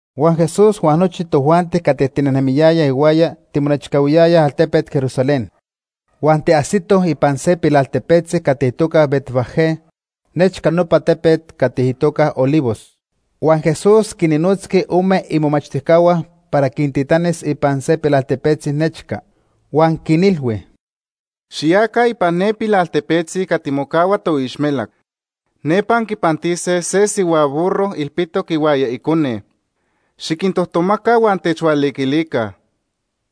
Huan Jesús huan nochi tojuanti cati tinejnemiyayaj ihuaya timonechcahuiyayaj altepet Jerusalén. Huan tiajsitoj ipan se pilaltepetzi cati itoca Betfagé, nechca nopa tepet cati itoca Olivos. Huan Jesús quinnotzqui ome imomachtijcahua para quintitanis ipan se pilaltepetzi nechca. Huan quinilhui: ―Xiyaca ipan ne pilaltepetzi cati mocahua toixmelac. Nepa anquipantise se sihua burro ilpitoc ihuaya icone. Xiquintojtomaca huan techhualiquilica.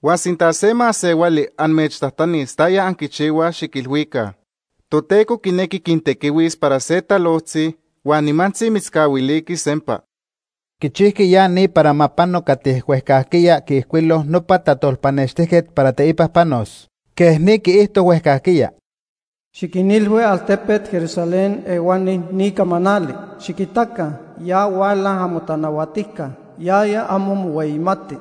Huan sinta se masehuali amechtajtanis taya anquichihuaj, xiquilhuica: ‘Toteco quinequi quintequihuis para se talojtzi huan nimantzi mitzcahuiliqui sempa.’ Quichijqui ya ni para ma pano cati huejcajquiya quiijcuilo nopa tajtolpanextijquet para teipa panos. Quej ni quiijto huejcajquiya: “Xiquinilhui altepet Jerusalén Altepet Jerusalén nojquiya itoca Sion. ejque ni camanali: ‘Xiquitaca, ya huala amotanahuatijca. Yaya amo mohueyimati.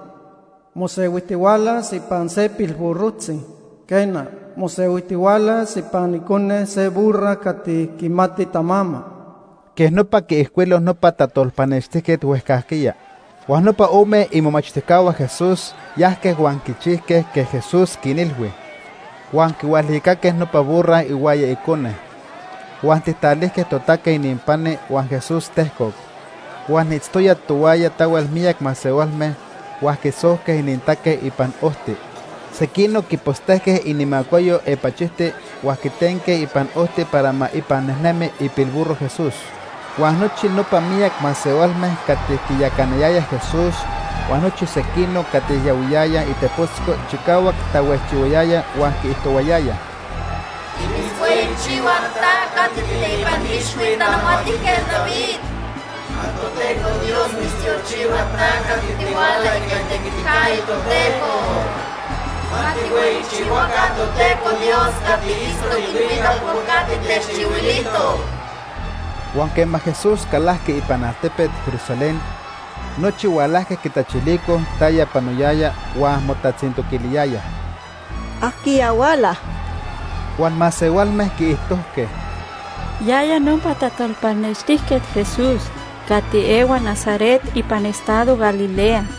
Mosehuijtihualas ipan se pilburrojtzi. Quena, mosehuijtihualas ipan icone se burra cati quimati tamama.’” Quej nopa quiijcuilo nopa tajtolpanextijquet huejcajquiya. Huan nopa ome imomachtijcahua Jesús yajque huan quichijque quej Jesús quinilhui. Huan quihualicaque nopa burra ihuaya icone. Huan tijtalijque totaque ininpani huan Jesús tejcoc. Huan itztoyaj tohuaya tahuel miyac masehualme huan quisojque inintaque ipan ojti. Sequinoc quipostejque inimacuayo apachijti huan quitenque ipan ojti para ma ipan nejnemi ipilburro Jesús. Huan nochi nopa miyac masehualme cati quiyacanayayaj Jesús huan nochi sequinoc cati yahuiyayaj itepotzco chicahuac tahuejchihuayayaj huan quiijtohuayayaj: “¡Timitzhueyichihuaj ta cati tiiteipan ixhui Tanahuatijquet David! ¡Ma Toteco Dios mitztiochihua ta cati tihuala ica itequiticayo Toteco! ¡Ma tijhueyichihuaca Toteco Dios cati itztoc ilhuicac por cati techchihuilijtoc!” Huan quema Jesús calajqui ipan altepet Jerusalén, nochi hualajque quitachilicoj taya panoyaya huan motatzintoquiliyayaj: ―¿Ajquiya huala? Huan masehualme quiijtojque: ―Yaya nopa tajtolpanextijquet Jesús cati ehua Nazaret ipan estado Galilea.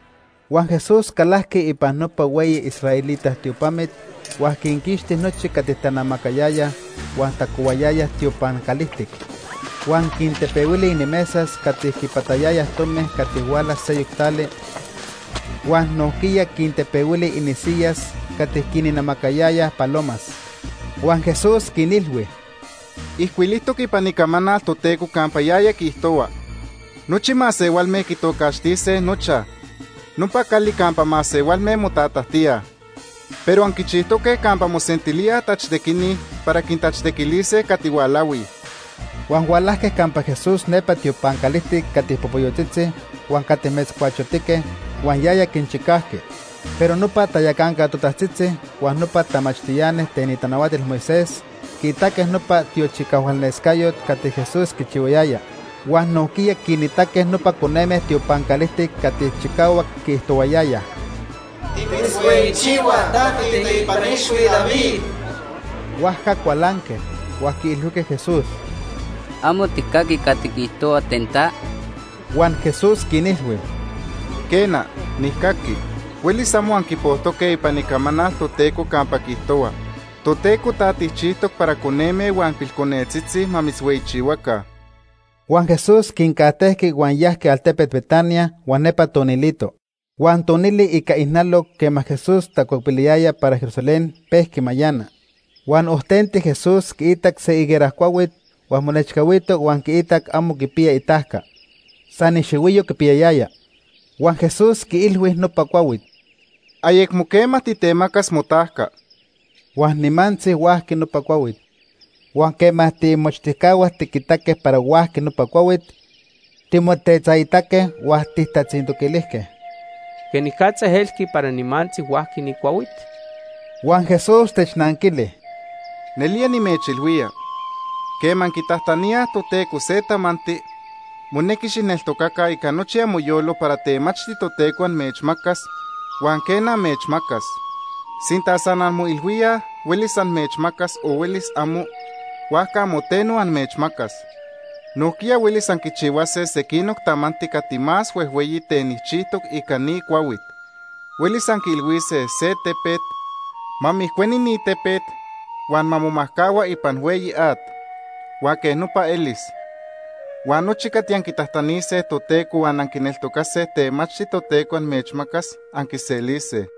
Huan Jesús calajqui ipan nopa hueyi israelita tiopamit huan quinquixti nochi cati tanamacayayaj huan tacohuayayaj tiopan calijtic. Huan quintepehuili inimesas cati quipatayayaj tomi cati huala seyoc tali, huan nojquiya quintepehuili inisiyas cati quinnamacayayaj palomas. Huan Jesús quinilhui: ―Ijcuilijtoc ipan Icamanal Toteco campa yaya quiijtohua: ‘Nochi masehualme quitocaxtise nochaj: Nopa Cali Campa Masehualme Motatajtíaj.’ Pero anquichijtoque campa mosentilíaj tachtequini para quintachtequilise cati hualahui. Huan hualajque campa Jesús nepa tiopan calijtic cati popoyotzitzi huan cati metzcuachotique, huan yaya quinchicajqui. Pero nopa tayacanca totajtzitzi huan nopa tamachtiani ten itanahuatil Moisés quiitaque nopa tiochicahualnescayot cati Jesús quichihuayaya, huan nojquiya quinitaque nopa coneme tiopan calijtic cati chicahuac quiijtohuayayaj: “Timitzhueyichihuaj, ta tiiteipan ixhui David.” Huajca cualanque, huan quiilhuijque Jesús: ―¿Amo tijcaqui cati quiijtohuaj ten ta? Huan Jesús quinilhui: ―Quena, nijcaqui. Huelis amo anquipojtoque ipan Icamanal Toteco campa quiijtohua: ‘Toteco ta tijchijtoc para coneme huan pilconetzitzi ma mitzhueyichihuaca.’ Huan Jesús quincajtejqui huan yajqui altepet Betania huan nepa tonilito. Huan tonili ica ijnaloc quema Jesús tacuepiliyaya para Jerusalén, pejqui mayana. Huan ojtenti Jesús quiitac se higuera cuahuit huan monechcahuito huan quiitac amo quipiya itajca. San ixihuiyo quipiyayaya. Huan Jesús quiilhui ten nopa cuahuit: ―Ni cuahuit ayecmo quema temacas motajca. Huan nimantzi huajqui nopa cuahuit. Huan quema tiimomachtijcahua tiquitaque para huajqui nopa cuahuit, timotetzaitaque huan tijtatzintoquilijque: ―¿Quenicatza elqui para nimantzi huajqui ni cuahuit? Huan Jesús technanquili: ―Nelía nimechilhuía, quema anquitajtaníaj Toteco se tamanti, monequi xijneltocaca ica nochi amoyolo para temachti Toteco amechmacas, huan quena amechmacas. Sinta san anmoilhuíaj huelis amechmacas o huelis amo, huajca amo teno amechmacas. Nojquiya huelis anquichihuase sequinoc tamanti cati más huejhueyi ten nijchijtoc ica ni cuahuit. Huelis anquiilhuise ten se tepet: ‘Ma mijcueni ni tepet huan ma momajcahua ipan hueyi at’, huan quej nopa elis. Huan nochi cati anquitajtanise Toteco huan anquineltocase temachti Toteco amechmacas, anquiselise.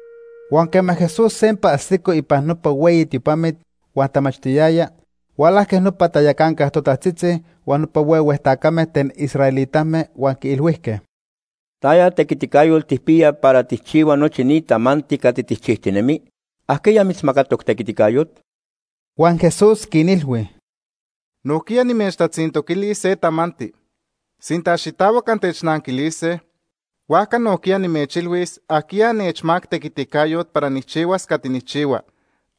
Huan quema Jesús sempa ajsico ipan nopa hueyi tiopamit huan tamachtiyaya, hualajque nopa tayacanca totajtzitzi huan nopa huehue tacame ten israelitame huan quiilhuijque: ―¿Taya tequiticayot tijpiya para tijchihua nochi ni tamanti cati tijchijtinemi? ¿Ajquiya mitzmacatoc tequiticayot? Huan Jesús quinilhui: ―Nojquiya nimechtatzintoquilis se tamanti. Sinta xitahuac antechnanquilise, huajca nojquiya nimechilhuis ajquiya nechmacac tequiticayot para nijchihuas cati nijchihua.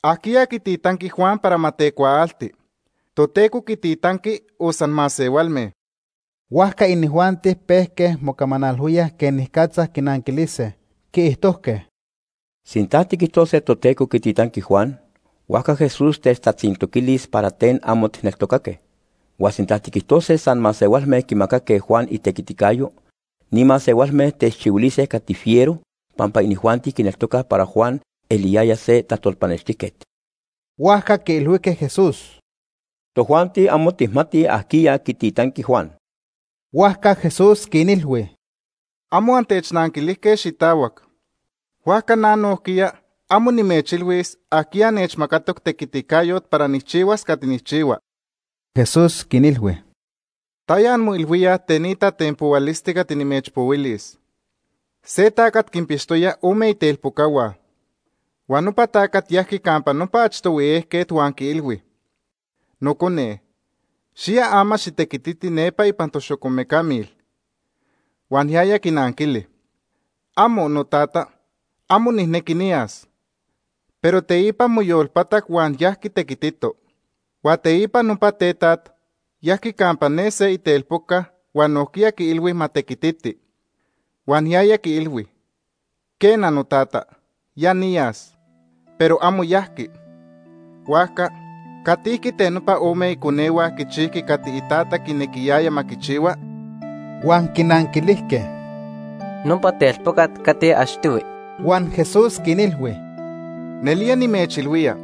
¿Ajquiya quititanqui Juan para ma tecuaaltiqui? ¿Toteco quititanqui o san masehualme? Huajca inijuanti pejque mocamanalhuíaj quenicatza quinanquilise. Quiijtojque: ―Sinta tiquijtose Toteco quititanqui Juan, huajca Jesús techtatzintoquilis para ten amo tijneltocaque. Huan sinta tiquijtose san masehualme quimacaque Juan itequiticayo, ni masehualme techchihuilise cati fiero, pampa inijuanti quineltocaj para Juan eliyaya se tajtolpanextijquet. Huajca quiilhuijque Jesús: ―Tojuanti amo tijmatij ajquiya quititanqui Juan. Huajca Jesús quinilhui: ―Amo antechnanquilijque xitahuac, huajca na nojquiya amo nimechilhuis ajquiya nechmacatoc tequiticayot para nijchihuas cati nijchihua. Jesús quinilhui: ―¿Taya anmoilhuíaj ten ni tatenpohualisti cati nimechpohuilis? Se tacat quinpixtoya ome itelpocahua. Huan nopa tacat yajqui campa nopa achtohui ejquet huan quiilhui: ‘Nocone, xiya ama xitequititi nepa ipan toxocomecamil.’ Huan yaya quinanquili: ‘Amo, notata, amo nijnequi niyas.’ Pero teipa moyolpatac huan yajqui tequitito. Huan teipa nopa tetaj yajqui campa ne se itelpoca huan nojquiya quiilhui ma tequititi. Huan yaya quiilhui: ‘Quena, notata, ya niyas.’ Pero amo yajqui. Huajca, ¿catijqui ten nopa ome iconehua quichijqui cati itata quinequiyaya ma quichihua? Huan quinanquilijque: ―Nopa telpocat cati achtohui. Huan Jesús quinilhui: ―Nelía nimechilhuía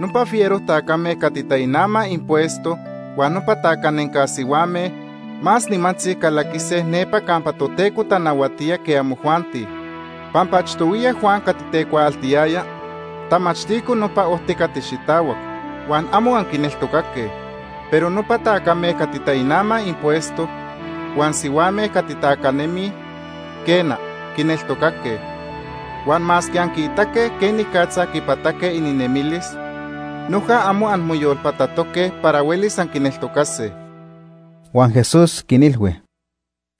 nopa fiero tacame cati tainamaj impuesto huan nopa tacanenca sihuame más nimantzi calaquise nepa campa Toteco tanahuatía que amojuanti. Pampa achtohuiya Juan cati tecuaaltiyaya tamachtico nopa ojti cati xitahuac, huan amo anquineltocaque. Pero nopa tacame cati tainamaj impuesto huan sihuame cati tacanemij, quena, quineltocaque. Huan masque anquiitaque quenicatza quipataque ininemilis, noja amo anmoyolpatatoque para huelis anquineltocase. Huan Jesús quinilhui: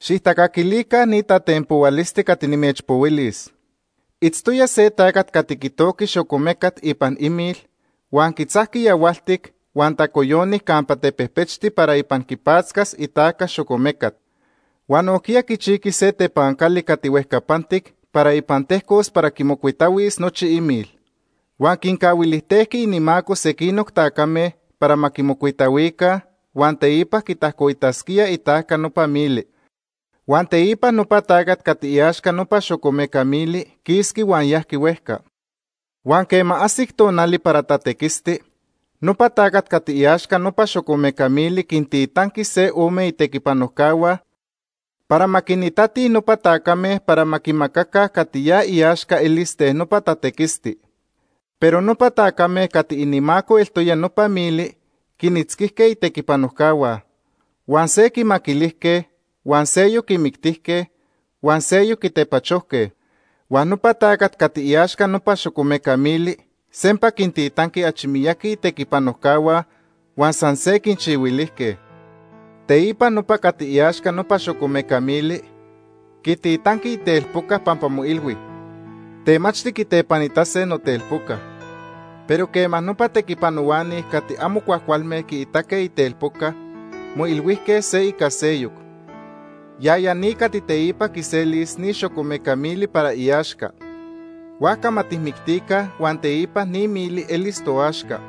―Xijtacaquilica ni tatenpohualisti cati nimechpohuilis. Itztoya se tacat cati quitojqui xocomecat ipan imil huan quitzajqui yahualtic huan tacoyoni campa tepejpechtita para ipan quipatzcas itajca xocomecat. Huan nojquiya quichijqui se tepancali cati huejcapantic para ipan tejcos para quimocuitahuis nochi imil. Huan quincahuilijtejqui inimaco sequinoc tacame para ma quimocuitahuica huan teipa ma quitajcoitasquíaj itajca nopa mili. Huan teipa nopa tacat cati iaxca nopa xocomeca mili quisqui huan yajqui huejca. Huan quema ajsic tonali para tatequisti, nopa tacat cati iaxca nopa xocomeca mili quintitanqui se ome itequipanojcahua para ma quinitatij nopa tacame para ma quinmacaca cati ya iaxca elis ten nopa tatequisti. Pero nopa tacame cati inimaco eltoya nopa mili quinitzquijque itequipanojcahua; huan se quimaquilijque, huan seyoc quimictijque, huan seyoc quitepachojque. Huan nopa tacat cati iaxca nopa xocomeca mili sempa quintitanqui achi miyaqui itequipanojcahua huan san se quinchihuilijque. “Teipa nopa cati iaxca nopa xocomeca mili quititanqui itelpoca pampa moilhui: ‘Temachti quitepanitase notelpoca’. Pero quema nopa tequipanohuani cati amo cuajcualme quiitaque itelpoca, moilhuijque se ica seyoc: ‘Yaya ni cati teipa quiselis ni xocomeca mili para iaxca. Huajca ma tijmictica huan teipa ni mili elis toaxca.’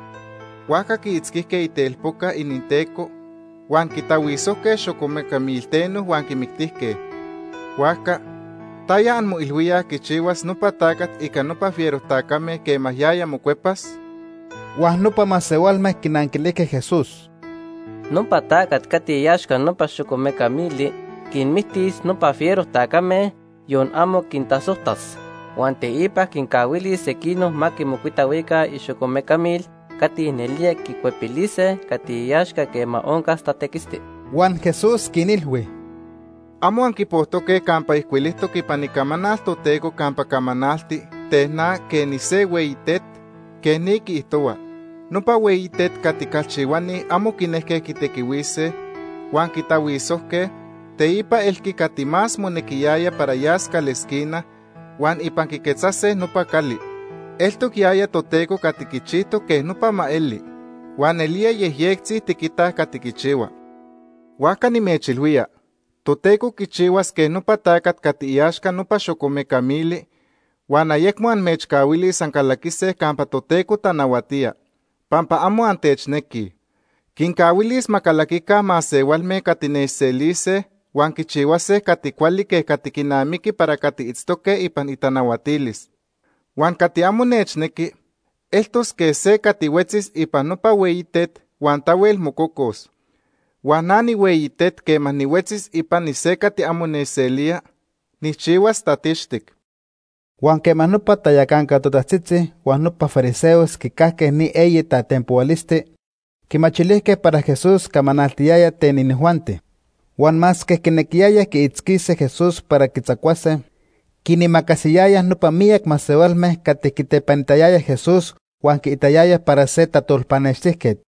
Huajca quiitzquijque itelpoca ininteco huan quitahuisojque xocomeca milteno huan quimictijque. “Huajca, ¿taya anmoilhuíaj quichihuas nopa tacat ica nopa fiero tacame quema yaya mocuepas?” Huan nopa masehualme quinanquilijque Jesús: ―Nopa tacat cati iaxca nopa xocomeca mili quinmictis nopa fiero tacame, yon amo quintasojtas. Huan teipa quincahuilis sequinoc ma quimocuitahuica ixocomecamil cati nelía quicuepilise cati iaxca quema oncas tatequisti. Huan Jesús quinilhui: ―¿Amo anquipojtoque campa ijcuilijtoc ipan Icamanal Toteco campa camanalti ten na quej nise hueyi tet? Quej ni quiijtohua: ‘Nopa hueyi tet cati calchihuani amo quinejque quitequihuise, huan quitahuisojque, teipa elqui cati más monequiyaya para yas calesquina, huan ipan quiquetzase nopa cali. Eltoc yaya Toteco cati quichijtoc quej nopa ma eli, huan nelía yejyectzi tiquitaj cati quichihua.’ Huajca nimechilhuía Toteco quichihuas quej nopa tacat cati iaxca nopa xocomeca mili huan ayecmo amechcahuilis ancalaquise campa Toteco tanahuatía pampa amo antechnequij. Quincahuilis ma calaquica masehualme cati nechselise huan quichihuase cati cuali quej cati quinamiqui para cati itztoque ipan itanahuatilis. Huan cati amo nechnequi eltos quej se cati huetzis ipan nopa hueyi tet huan tahuel mococos. Huan na nihueyi tet quema nihuetzis ipani se cati amo nechselía, nijchihuas tatixtic. Huan quema nopa tayacanca totajtzitzi huan nopa fariseos quicajque ni eyi tatenpohualisti, quimachilijque para Jesús camanaltiyaya ten inijuanti. Huan masque quinequiyayaj quiitzquise Jesús para quitzacuase, quinimacasiyayaj nopa miyac masehualme cati quitepanitayayaj Jesús huan quiitayayaj para se tajtolpanextijquet.